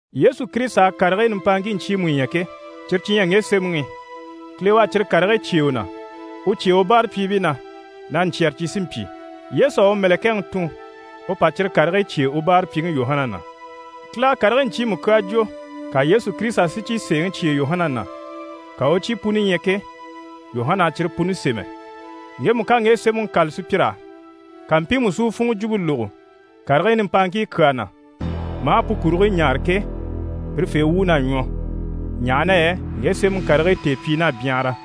Yesu Kirisita à karigii nimpaaŋkii ɲcyiimu ɲya ke, cyire cyi ɲyɛ ŋge sémɛŋi i. Kile u à cyire karigii cyêe u na, u cyêe u báarapyiibii na na ɲcyɛ̀rɛ cyi sí n-pyi. Yesu à u mɛ̀lɛkɛŋi tun u pa cyire karigii cyêe u báarapyiŋi Yuhana na. Kile à karigii ɲcyiimu kyaa jwo, ka Yesu Kirisita si cyi sèeŋi cyêe Yuhana na, ka u u cyi puni ɲya ke, Yuhana à cyire puni sémɛ. Ŋgemu ká ŋge sémɛŋi kâla sùpyir'á, ka mpiimu si u funŋɔ jwumpe lógo karigii nimpaaŋkii kyaa na, maa pu kurigii ɲáare ke, pirefee wuun'à ɲwɔ, ɲaha na yɛ ŋge sémɛŋi karigii tèepyiin'à byanhara.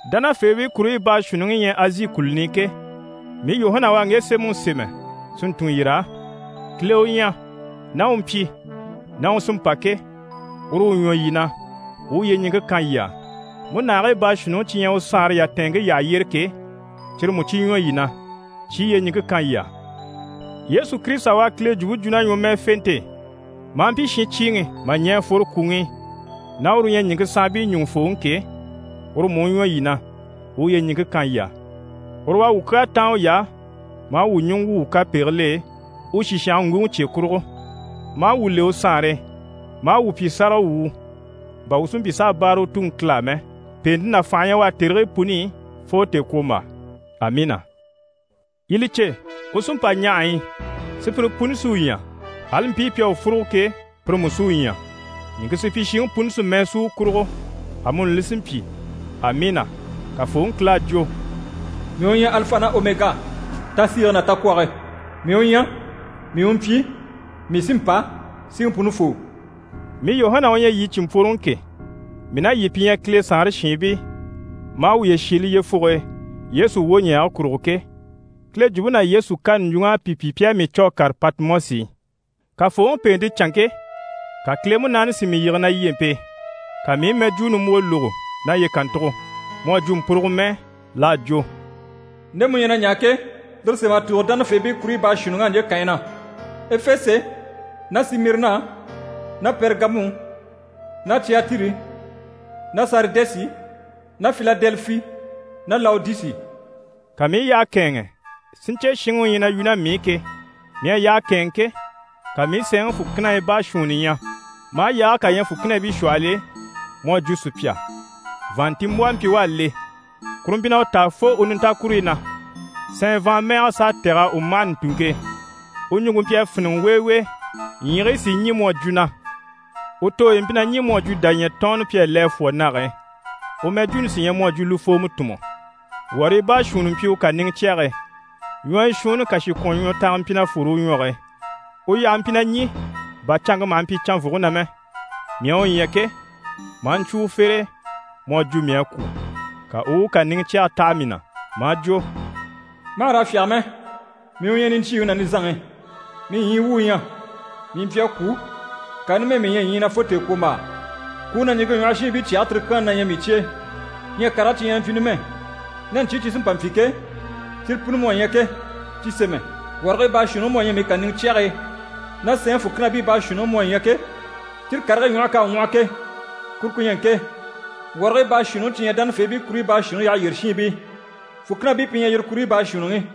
Dánafeebii kuruɲyi baashuunniŋi yi ɲyɛ Azi kùluni i ke, mii Yuhana u à ŋge sémɛŋi sémɛ si ntun yir'á. Kileŋi u ɲyɛ, ná u mpyi, ná u sí n‑pa ke, uru u ɲwɔ yii na, u u yyeɲiŋke kan yii á. Múnahigii baashuunniŋi cyi ɲyɛ u saanre yatɛɛnŋke yyaha yyére ke, cyire mú cyi ɲwɔ yii na, cyi i yyeɲiŋke kan yii á. Yesu Kirisita u à Kile jwumpe jwo ná ɲwɔmɛɛfente e, maa mpyi shincyiiŋi mà ɲɛ̀ a fworo kwùŋi i ná uru u ɲyɛ ɲìŋke saanbii ɲùŋufooŋi ke, uru mú u ɲwɔ yii na, u u yyeɲiŋke kan yii á. Uru u à wuu kyaa táan uy'á maa wuu ɲùŋɔ wwû wuu kapegigil'e, u sìshange ŋguŋi cye kurugo, maa wuu le u Saanre e, maa wuu pyi sáragawwuu, bà wuu si mpyi s'a báare u Tuŋi Kile á mɛ. Pèente ná fànhe na ɲyɛ u á tèrigii puni i, fo tèekwombaa. Amiina! Yii li cè, u sí n‑pa ɲahaɲyi i! Sùpyire puni sí u ɲya, ali mpii pi à u fúrugo ke, pire mú sí u ɲya. Ɲìŋke supyishiŋi puni sí mɛɛ sú u kurugo. Amuni li sí n‑pyi. Amiina. Kafooŋi Kile à jwo: «Mii u ɲyɛ Alifa ná Omega--tasiige ná takwɔge. Mii u ɲyɛ, mii u mpyi, mii sí n‑pa, Siŋi Punifoo.» Mii Yuhana u ɲyɛ yii cìnmpworoŋi ke, mii ná yii pi ɲyɛ Kile saanre shiinbii, maa wuye shiile yyefuge e Yesu wwoɲɛɛge kurugo ke, Kile jwumpe ná Yesu kani ɲjwuŋ'à pi pyi pi à mii cû a kàre Patimɔsi i. Kafooŋi pèente canŋke, ka Kile Munaani si mii yige na lyempe e, ka mii i mɛjwuu nimbwoo lógo naye kàntugo mu à jwo mpurugo mɛɛ. L'à jwo: «Nde mu ɲyɛ na ɲaa ke, lire sém'a tùugo dánafeebii kuruɲyi baashuunniŋ'á ɲje kànyi na: Efese ná Simirina ná Pɛrigamu ná Cyatiri ná Saridɛsi ná Filadɛlifi ná Lawodisi.» Ka mii i yyaha kɛ̂ɛnŋɛ si ɲcè shinŋi u ɲyɛ na yu ná mii i ke. Mii à yyaha kɛ̂ɛnŋɛ ke, ka mii i sɛɛnŋi fùkinahii baashuunni ɲya, maa yaage kà ɲya fùkinabii shwɔhɔl'e mu à jwo sùpya. Vàanntinmbwɔhɔ mpyi u à le, kuru mpyi na u taa fo u nintakuruyi na, sɛɛn vàanmɛɛgɛ s'à tɛ̀g'a u mâhana u ntùŋke e. U ɲùŋke mpyi a fíniŋɛ weewee, ɲyiigii sí i ɲî mu à jwo na. U tooyi mpyi na ɲî mu à jwo dàɲyɛ tɔɔnnɔ pi à le a fwɔ̀ nage e, u mɛjwuuni sí ɲyɛ mu à jwo lufoomɔ tùnmɔ. Wɔrii baashuunni mpyi u kàniŋɛ cyɛge e. Ɲwɔyɔ shuunni kàshikwɔnŋwɔtanga mpyi na fwore u ɲwɔge e. U yyahe mpyi na ɲî bà canŋke maha mpyi canvwuge na mɛ. Mii à u ɲya ke, maa ɲcwo u fere e, mu à jwo mii à kwû. Ka u u u kàniŋɛ cyɛge taha mii na, maa jwo: «Mà hà raa fyáge mɛ, mii u ɲyɛ niɲcyiiŋi ná nizanŋi. Mii ɲyii wu u ɲyɛ. Mii mpyi a kwû, ŋka numɛ mii ɲyɛ ɲyii na fo tèekwombaa. Kwùŋi ná ɲìŋke ɲwɔhɔ shiinbii cyage tirikyaanni na ɲyɛ mii cye e. Ɲyɛ karigii cyi ɲyɛ na mpyi numɛ, ná ɲcyii cyi sí n‑pa n‑pyi ke, cyire puni mu à ɲya ke, cyi sémɛ. Wɔrigii baashuunniŋi mu à ɲya mii kàniŋɛ cyɛge e, ná sɛɛnŋi fùkinabii baashuunniŋi mu à ɲya ke, cyire karigii ɲwɔhe k'à ŋwɔhɔ ke, kuru ku ɲyɛ ŋke: wɔrigii baashuunniŋi cyi ɲyɛ dánafeebii kuruɲyi baashuunniŋi yyaha yyére shiinbii. Fùkinabii pi ɲyɛ yire kuruɲyi baashuunniŋi.